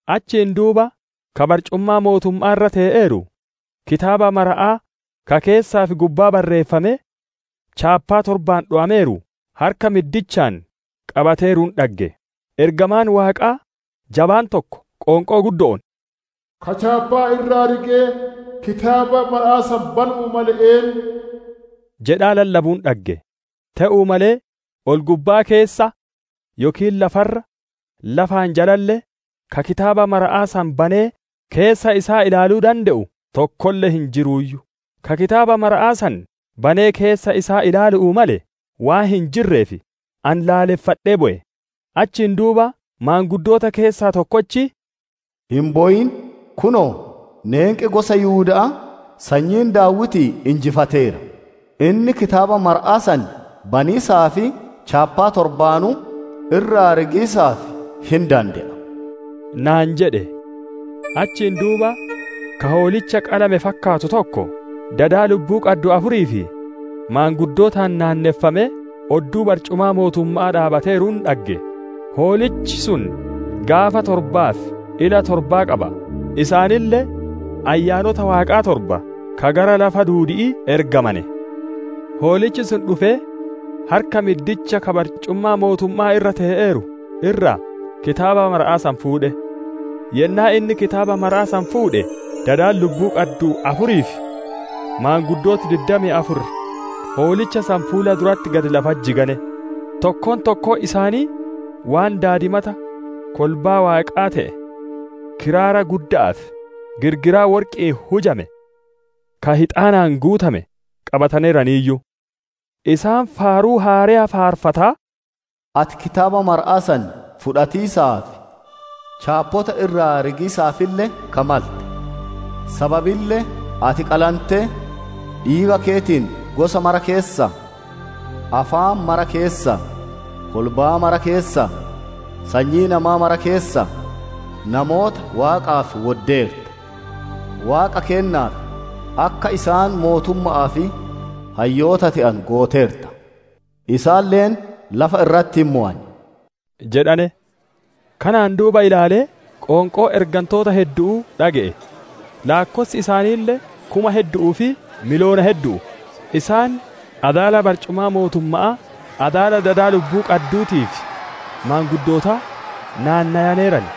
Achiin duuba ka barcumaa mootumma'aa irra tee'eeru, kitaaba maramaa ka keessaa fi gubbaa barreeffamee, chaappaa torbaan dhowameeru harka middichaan qabateeruun dhagge. Ergamaan Waaqaa jabaan tokko qoonqoo guddo'oon, «Ka chaappaa irraa rigee kitaaba maramaa san banu'uu male eennu?» jedhaa lallabuun dhagge. Te'uu malee ol-gubbaa keessa yookiin lafa irra, lafaan jalalle, ka kitaaba maramaa san banee keessa isaa ilaaluu dande'u tokkolle hin jiruuyyu. Ka kitaaba maramaa san banee keessa isaa ilaalu'uu male waan hin jirreef, ani laalleffadhee bowe. Achiin duuba maanguddoota keessaa tokkochi, «Hin bowin! Kunoo, neenqi gosa Yihuda'aa, sanyiin Daawitii injifateera; inni kitaaba maramaa san baniisaa fi chaappaa torbaanuu irraa rigiisaaf hin dande'a» naan jedhe. Achiin duuba, ka Hoolicha qalame fakkaatu tokko, dada lubbuu qaddu afurii fi maanguddootaan naanneffamee, odduu barcumaa mootumma'aa dhaabbateeruun dhagge. Hoolichi sun gaafa torbaa fi ila torba qaba; isaaniille Ayyaanota Waaqaa torba ka gara lafa duudi'ii ergamane. Hoolichi sun dhufee, harka middicha ka barcumaa mootumma'aa irra tee'eeru irraa kitaaba maramaa san fuudhe. Yennaa inni kitaaba maramaa san fuudhe, dadi lubbuu qaddu afurii fi maanguddooti diddamii afur Hoolicha san fuula duratti gad lafatti jigane; tokkoon tokkoon isaanii waan daadimata kolbaa Waaqaa te'e kiraara gudda'aa fi girgiraa worqi'iin hujame ka hixaanaan guutame qabataneeraniiyyu. Isaan faaruu haareya faarfataa, «Ati kitaaba maramaa san fudhatiisaaf, chaappota irraa rigiisaafille ka malte; sababille ati qalantee, dhiiga keetiin gosa maraa keessaa, afaan maraa keessaa, kolbaa maraa keessaa, sanyii nama maraa keessaa, namoota Waaqaaf wodatteerta. Waaqa keennaaf, akka isaan mootumma'aa fi hayyoota te'anu gooteerta; isaaniille lafa irratti hin mowan» jedhane. Kanaan duuba ilaalee, qoonqoo ergantoota heddu'uu dhage'e; laakkossi isaaniille kuma heddu'uu fi miliyoona heddu'u. Isaan adaala barcumaa mootumma'aa, adaala dada lubbuu qadduutii fi maanguddootaa naannowaneeran.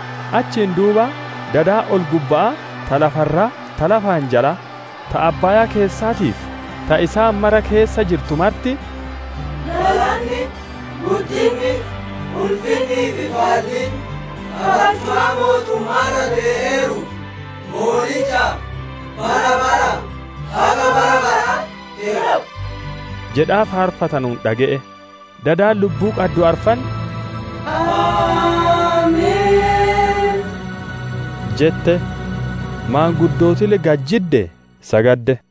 Achiin duuba dadi ol-gubba'aa, ta lafa irraa, ta laafaan jalaa, ta abbaayaa keessaatii fi ta isaan mara keessa jirtu marti, «Galanni, guddinni, ulfinnii fi baalliin, ka barcumaa mootumma'aa irra tee'eeruu fi Hoolichaaf, bara baraa haga bara baraa te'u» jedhaa faarfatanuun dhage'e. Dadi lubbuu qaddu arfan, «Ameen!» jette; maanguddootille gad jiddee sagadde.